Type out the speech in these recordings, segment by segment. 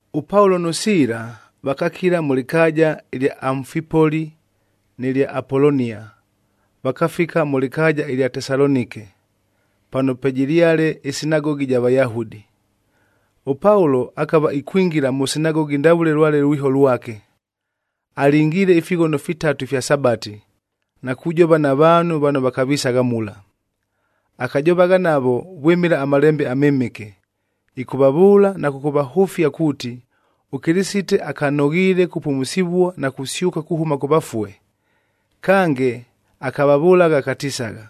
ɄPaulo nʉ Siila vakakila mʉ lɨkaaja ɨlya Amfipoli nɨ lya Apolonia, vakafika mʉ lɨkaaja ɨlya Tesalonike, pano pwejɨlyale ɨsinagogi ɨja Vayahudi. ɄPaulo akava ikwingila mʉ sinagogi ndavʉle lwale ʉlwiho lwake. Alingiile ifighono fitatu ifya Sabati, na kujova na vaanhu vano vakavisagha mula. Akajovagha navo vwɨmɨla aMalembe aMɨmɨke, ɨkʉvavʉʉla na kʉkʉvahʉfia kuuti, ʉKɨlɨsite akanoghiile kupumusivua na kusyʉka kuhʉma kʉ vafue. Kange, akavavʉlagha akatisagha,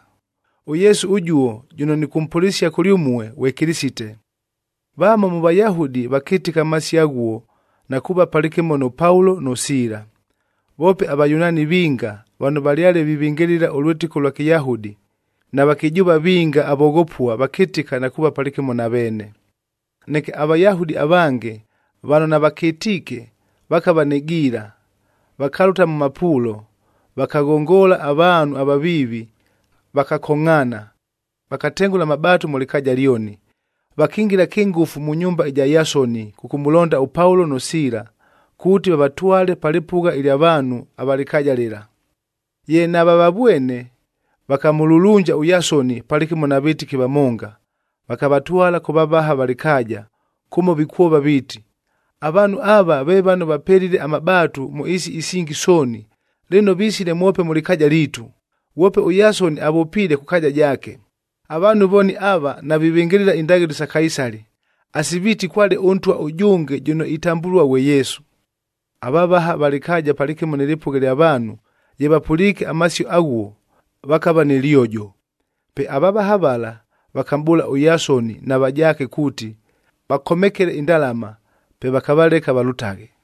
“ɄYesu ʉjuo jʉno nɨkʉmpʉlɨsia kʉlyʉmue ghwe Kɨlɨsite.” Vamo mʉ Vayahudi vakɨtɨka amasio aghuo na kuuva palɨkɨmo nʉ Paulo nʉ Siila. Voope aVayunaani vinga vano valyale vivɨngɨlɨla ʉlwɨtɨko ʉlwa Kɨyahudi, na vakɨjʉʉva vinga avoghopua vakɨtɨka na kuuva palɨkɨmo na veene. Neke aVayahudi avange vano navakɨtiike vakava nɨ giila, vakalʉta mʉ mapuulo, vakaghongola avaanhu avaviivi, vakakongʼhaana, vakatengʉla amabaatu mʉ lɨkaaja lyoni. Vakingila kɨngʉfu mʉ nyumba ɨja Yasoni kʉkʉmʉlonda ʉPaulo nʉ Siila, kuuti vavatwale pa lɨpʉgha ɨlya vaanhu ava lɨkaaja lɨla. Ye navavavwene, vakamʉlulunja ʉYasoni palɨkɨmo na vɨtɨki vamonga, vakavatwala kʉ vavaha va lɨkaaja, kʉmo vikwova viiti, “Avaanhu ava ve vano vapelile amabaatu mʉ ɨɨsi isingi sooni, lɨno visile mwope mʉ lɨkaaja liitu, ghwope ʉYasoni avʉpiile kʉ kaaja jaake! Avaanhu vooni ava, navivɨngɨlɨla indaghɨlo sa Kaisali,a asi viiti kwale ʉntwa ʉjʉnge jʉno itambʉlua ghwe Yesu.” Avavaha va lɨkaaja palɨkɨmo nɨ lɨpʉgha lya vaanhu, ye vapʉliike amasio aghuo, vakava nɨ lyojo. Pe avavaha vala vakamʼbʉʉla ʉYasoni na vajaake kuuti, vakomekele indalama,b pe vakavaleka valʉtaghe.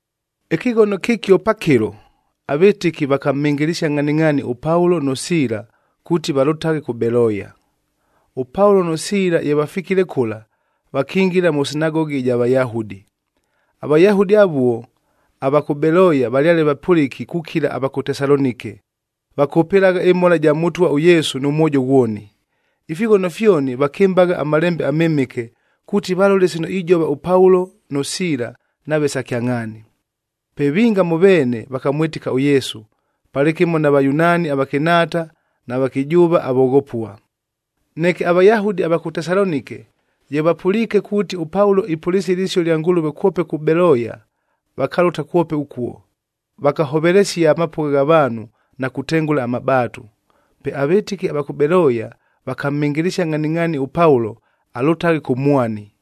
Ɨkɨghono kɨkio pakɨlo, avɨtɨki vakamhɨngɨlɨsia ngʼhaningʼhaani ʉPaulo nʉ Siila kuuti valʉtaghe kʉ Beloya. ɄPaulo nʉ Siila ye vafikile kʉla, vakingila mʉ sinagogi ɨja Vayahudi. AVayahudi avuo ava kʉ Beloya valyale vapʉlɨki kukila ava kʉ Tesalonike, vakʉpɨlagha ɨmhola ɨja Mʉtwa ʉYesu nʉ mwojo ghwoni. Ifighono fyoni vakɨmbagha aMalembe aMɨmɨke, kuuti valole sino ijova ʉPaulo nʉ Siila nave sa kyangʼhaani. Pe vinga mʉ veene vakamwɨtɨka ʉYesu, palɨkɨmo na Vayunaani avakɨnhaata na vakɨjʉʉva avoghopua. Neke aVayahudi ava kʉ Tesalonike, ye vapʉliike kuuti, ʉPaulo ipʉlɨsia ɨlɨsio ɨlya Ngʉlʉve kwope kʉ Beloya, vakalʉta kwope ʉkuo, vakahovelesia amapʉgha gha vaanhu na kutengʉla amabaatu. Pe avɨtɨki ava kʉ Beloya vakamhɨngɨlɨsia ngʼhaningʼhaani ʉPaulo alʉtaghe kʉ mwani,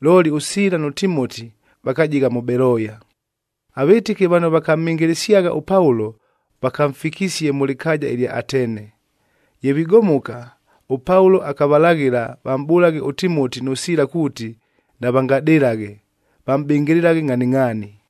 looli ʉSiila nʉ Timoti vakajigha mʉ Beloya. Avɨtɨki vano vakamhɨngɨlɨsyagha ʉPaulo vakamfikisie mʉ lɨkaaja ɨlya Atene. Ye vigomoka, ʉPaulo akavalaghɨla vamʼbʉlaghe ʉTimoti nʉ Siila kuuti navangadɨlaghe, vamʼbɨngɨlɨlaghe ngʼhaningʼhaani.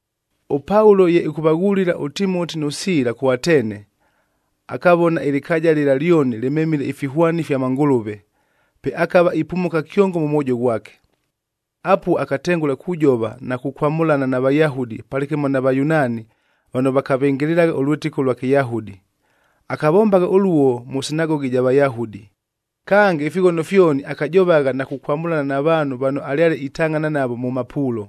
ɄPaulo ye ɨkʉvaghulila ʉTimoti nʉ Siila kʉ Atene, akavona ɨlɨkaaja lɨla lyoni lɨmemile ifihwani ifya mangʉlʉve, pe akava ipumuka kyongo mʉ mwojo ghwake. Apuo akatengʉla kujova na kukwamʉlana na Vayahudi palɨkɨmo na Vayunaani vano vakavɨngɨlɨlagha ʉlwɨtɨko ʉlwa Kɨyahudi. Akavombagha ʉluo mʉ sinagogi ɨja Vayahudi. Kange ifighono fyoni, akajovagha na kukwamʉlana na vaanhu vano alyale itangʼhana navo mʉ mapuulo.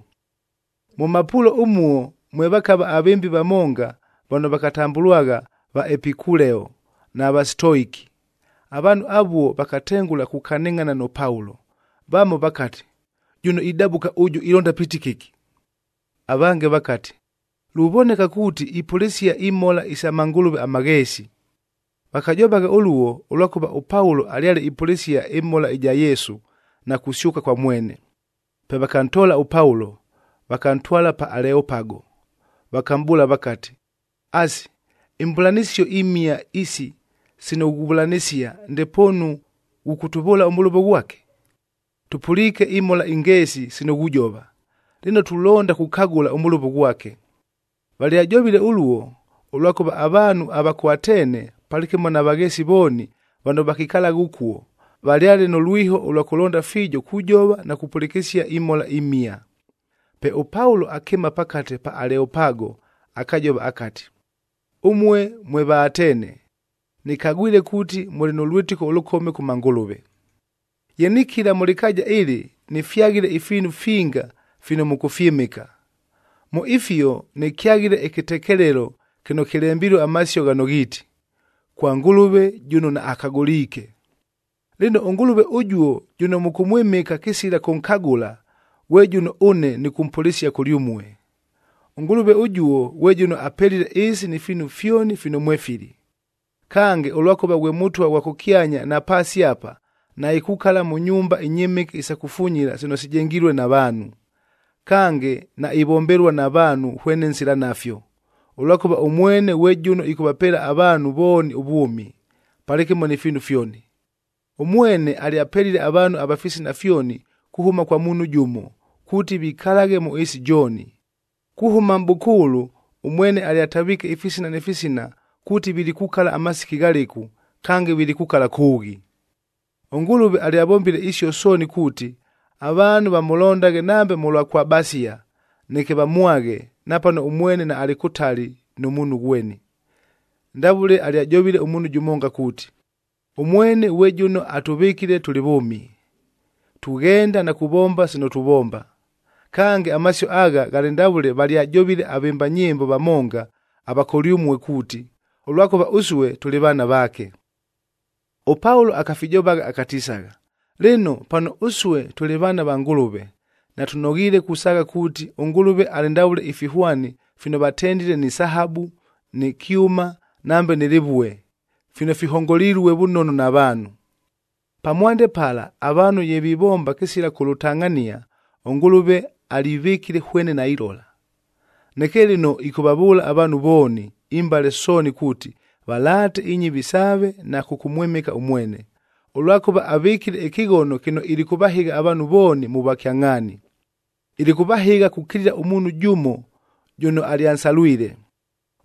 Mʉ mapuulo ʉmuo mwe vakava avɨmbi vamonga vano vakatambʉlwagha Vaepikuleoc na Vasitoiki.d Avaanhu avuo vakatengʉla kukanɨngʼhana nʉ Paulo. Vamo vakati, “Jʉno idabʉka ʉjʉ ilonda piiti kɨki?” Avange vakati, “Luvoneka kuuti ipʉlɨsia imhola isa mangʉlʉve amagheesi.” Vakajovagha ʉluo, ʉlwakʉva ʉPaulo alyale ipʉlɨsia ɨmhola ɨja Yesu, na kusyʉka kwa mwene. Pe vakantoola ʉPaulo, vakantwala pa Aleopago,e vakamʼbʉʉla vakati, “Asi, imbʉlanɨsio imhia isi sino ghuvʉlanɨsia, ndepoonu ghʉkʉtʉvʉʉla ʉmʉlʉvo ghwake? Tʉpʉliike imhola ingeesi sino ghujova, lɨno tulonda kukagʉla ʉmʉlʉvo ghwake.” Valyajovile ʉluo, ʉlwakʉva avaanhu ava kʉ Atene palɨkɨmo na vagheesi vooni vano vakikalagha ʉkuo, valyale nʉ lwiho ʉlwa kʉlonda fiijo kujova na kupʉlɨkɨsia imhola imhia. Pe ʉPaulo akɨɨma pakate pa Aleopago akajova akati, “Ʉmue mwe Vaatene! Nɨkagwile kuuti mʉlɨ nʉ lwɨtɨko ʉlʉkome kʉ mangʉlʉve. Ye nikila mʉ lɨkaaja ɨlɨ, nɨfyaghile ifiinu finga fino mʉkʉfyɨmɨka. Mʉ ifio nɨkyaghile ɨkɨtekelelo kɨno kɨlembilue amasio ghano ghiiti, KWA NGɄLɄVE JɄNO NAAKAGɄLIIKE. Lɨno, ʉNgʉlʉve ʉjuo jʉno mʉkʉmwɨmɨka kɨsila kʉnkagʉla, ghwe jʉno ʉne nɨkʉmpʉlɨsia kʉlyʉmue. “ɄNgʉlʉve ʉjuo ghwe jʉno apelile ɨɨsi ni fiinu fyoni fino mwefili. Kange, ʉlwakʉva ghwe Mʉtwa ghwa kʉkyanya na paasi apa, naikukala mʉ nyumba inyɨmɨke isa kufunyila sino sijengilue na vaanhu. Kange, naivombelua na vaanhu hwene nsila nafyo, ʉlwakʉva ʉmwene ghwe jʉno ɨkʉvapeela avaanhu vooni ʉvwʉmi, palɨkɨmo ni fiinu fyoni. Ʉmwene alyapelile avaanhu ava fisina fyoni kuhʉma kwa muunhu jʉmo, kuuti vikalaghe mʉ ɨɨsi jooni. Kuhʉma mʼbʉkʉʉlʉ ʉmwene alyataviike ifisina ni fisina kuuti vilikukala amasiki ghalɨku, kange vilikukala kʉʉghi. ɄNgʉlʉve alyavombile isio sooni kuuti, avaanhu vamʉlondaghe nambe mʉlwa kwabasia, neke vamwaghe napano ʉmwene naalɨ kʉtali nʉ muunhu ghweni. Ndavʉle alyajovile ʉmuunhu jʉmonga kuuti, ‘Ʉmwene ghwe jʉno atʉvɨkile tʉlɨ vʉʉmi, tughenda na kuvomba sino tuvomba!’ “Kange amasio agha, ghalɨ ndavʉle valyajovile avɨmba nyɨmbo vamonga ava kʉlyʉmue kuuti, ‘Ʉlwakʉva ʉsue tʉlɨ vaana vaake.’” ɄPaulo akafijovagha akatisagha, “Lɨno, pano ʉsue tʉlɨ vaana va Ngʉlʉve, natʉnoghiile kusaagha kuuti, ʉNgʉlʉve alɨ ndavʉle ifihwani fino vatendile nɨ sahabu, nɨ kyʉma nambe nɨ lɨvue, fino fihongolilue vʉnono na vaanhu. Pamwande pala avaanhu ye vivomba kɨsila kʉlʉtangʼhania, ʉNgʉlʉve alivɨkile hwene nailola. Neke lɨno ɨkʉvavʉʉla avaanhu vooni, imbale sooni kuuti, valaate inyɨvi saave na kʉkʉmwɨmɨka ʉmwene, ʉlwakʉva avɨkile ɨkɨghono kɨno ilikʉvahɨgha avaanhu vooni mʉ vwakyangʼhaani. Ilikʉvahɨgha kukilila ʉmuunhu jʉmo jʉno alyansalwile.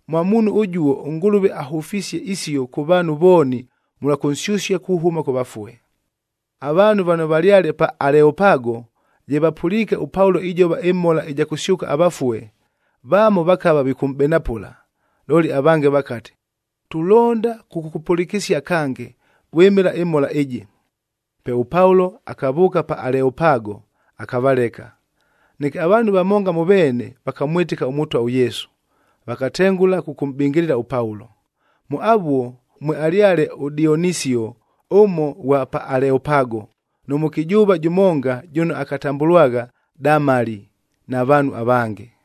Mwa muunhu ʉjuo ʉNgʉlʉve ahʉfisie isio kʉ vaanhu vooni mʉlwa kʉnsyʉsia kuhʉma kʉ vafue.” Avaanhu vano valyale pa Aleopago, ye vapʉliike ʉPaulo ijova ɨmhola ɨja kʉsyʉka avafue, vamo vakava vikʉmʼbenapʉla, looli avange vakati, “Tulonda kʉkʉkʉpʉlɨkɨsia kange, vwɨmɨla ɨmhola ɨjɨ.” Pe ʉPaulo akavʉʉka pa Aleopago, akavaleka. Neke avaanhu vamonga mʉ veene vakamwɨtɨka ʉMʉtwa ʉYesu, vakatengʉla kʉkʉmʼbɨngɨlɨla ʉPaulo. Mʉ avuo mwealyale ʉDionisio ʉmo ʉghwa pa Aleopago, nʉ mʉkɨjʉʉva jʉmonga jʉno akatambʉlwagha Damali, na vaanhu avange.